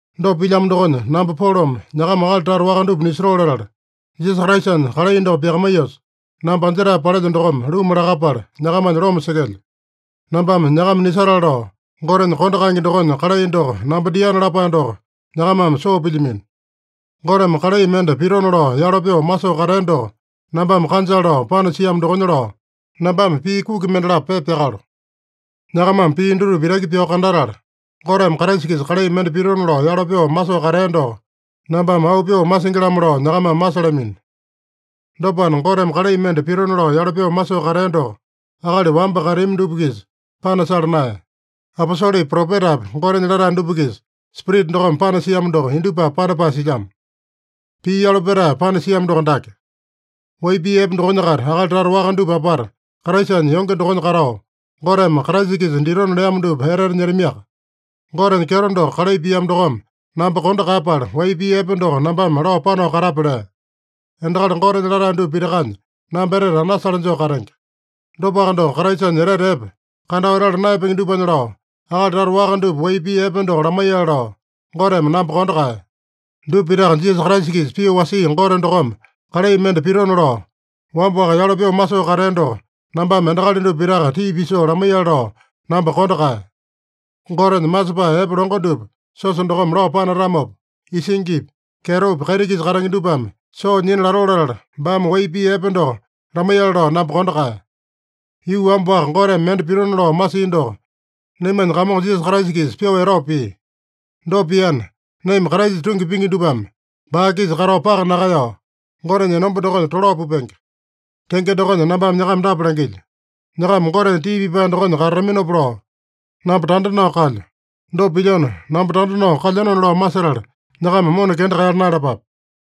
Dopa pilyamo dokonya, namba Polome nyakama akali tata waka dupa nisotoo latala, Jisasa Kraisanya kalai doko pyakamaiyosa, namba anjetae palelyo dokome luma lakapala, nyakamanya loma sekelyo. Nambame nyakama nisatale lao, Gotenya kondo kaenge dokonya kalai doko namba diana lapae doko nyakamame soo pilyamino. Goteme kalai mende pitona lao yalo pyoo masoo katea doko nambame kanjale lao panasiamo dokonya lao, nambame pii kuki mendalapo pepa pyakalo. Nyakamame pii dutupa itaki pyao kandatala, Goteme Kraisa-kisa kalai mende pitona lao yalo pyoo masoo katea doko nambame auu pyoo masingi-lamo lao nyakamame masalamino. Dopana, Goteme kalai mende pitona lao yalo pyoo masoo katea doko akali wamba kateami dupa-kisa panasala naeya. Aposolepi, propetapi, Gotenya latae dupa-kisa Spirita dokome panasiamo doko indupapi panapae silyamo. Pii yalo petae panasiamo doko dake: Wai pii epe dokonya-kaita akali tata waka dupa apata Kraisanya yonge dokonya katao, Goteme Kraisa-kisa ditona leamo dupa etete nyetamiaka. Gotenya kyeto doko kalai piamo dokome namba kondo kaeyapala, wai pii epe doko nambame lao panao katape lea. Endakali Gotenya latae dupa pitakanya namba etete anasale joo katenge. Dopaka doko, Kraisanya etete epe, kandao etala naeyapenge dupanya lao, akali tata waka dupa wai pii epe doko lamaiyale lao, Goteme namba kondo kaeya. Dupa pitaka Jisasa Kraisa-kisa pyoo wasia Gote dokome kalai mende pitona lao, wamba-waka yalo pyoo masoo katea doko nambame endakali dupa pitaka tii pisoo lamaiyale lao namba kondo kaeya. Gotenya masepae epe longo dupa siosa dokome lao panatamopa, isingipi, kyetopi, kaiti-kisa katenge dupame soo nyina latoo latala, baame wai pii epe doko lamaiyale lao namba kondo kaeya. Yuu wamba-waka Goteme mende pitona lao masia doko naimanya Kamongo Jisasa Kraisa-kisa pyoo etao pia. Dopa piana, naima Kraisa tungi pingi dupame baa-kisa katao paka nakaeyao, Gotenya enomba dokonya tolao pupenge. Tenge dokonya nambame nyakama dapa langilyo: Nyakama Gotenya tii pipae dokonya katataminopa lao, namba tanda nao kalyo. Dopa pilyona, namba tanda nao kalyenona lao masetala, nyakama mona kenda kaeyala naeyalapape.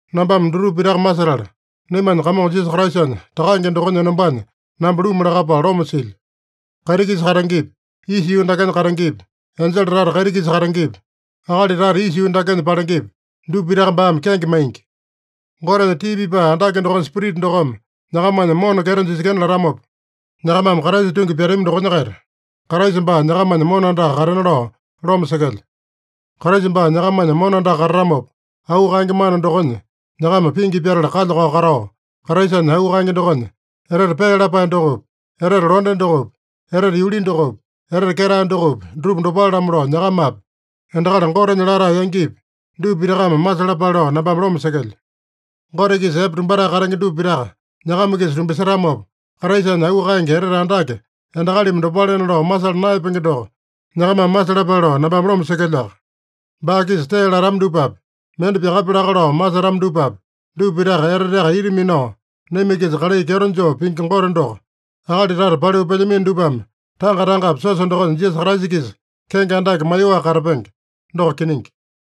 Nambame dutupa pitaka masetala, naimanya Kamongo Jisasa Kraisanya Takange dokonya enombanya namba luma lakapala loma silyo. Kaiti-kisa katengepi, isa yuu dakenya katengepi, enjele tata kaiti-kisa katengepi, akali tata isa yuu dakenya palengepi, dupa pitaka baame kenge maingi. Gotenya tii pipae andake dokonya Spirita dokome nyakamanya mona kyeto jisekena latamopa, nyakamame Kraisa tungi pyatami dokonya-kaita, Kraisa baa nyakamanya mona andaka katena lao loma sekelyo. Kraisa baa nyakamanya mona andaka katatamopa, auu kaenge mana dokonya nyakama pingi pyatala kalya-kao katao, Kraisanya auu kaenge dokonya etete pee lapae dokopi, etete londe dokopi, etete yuli dokopi, etete ketae dokopi, dutupa dopale-lamo lao, nyakamapi, endakali Gotenya latae yangipi, dupa pitakame masalapale lao nambame loma sekelyo. Gote-kisa epe tumbatae katenge dupa pitaka nyakama-kisa tumbasetamopa, Kraisanya auu kaenge etete andake, endakalimi dopalena lao masala naeyapenge doko nyakamame masalapale lao nambame loma sekelyoaka. Baa-kisa tee latama dupapi, mende pyakapya laka lao masetama dupapi, dupa pitaka eteteaka ita minao naima-kisa kalai kyeto joo pingi Gote doko, akali tata paliu pelyamino dupame tanga-tangapi siosa dokonya Jisasa Kraisa-kisa kenge andake maiyoaka katapenge. Doko kiningi.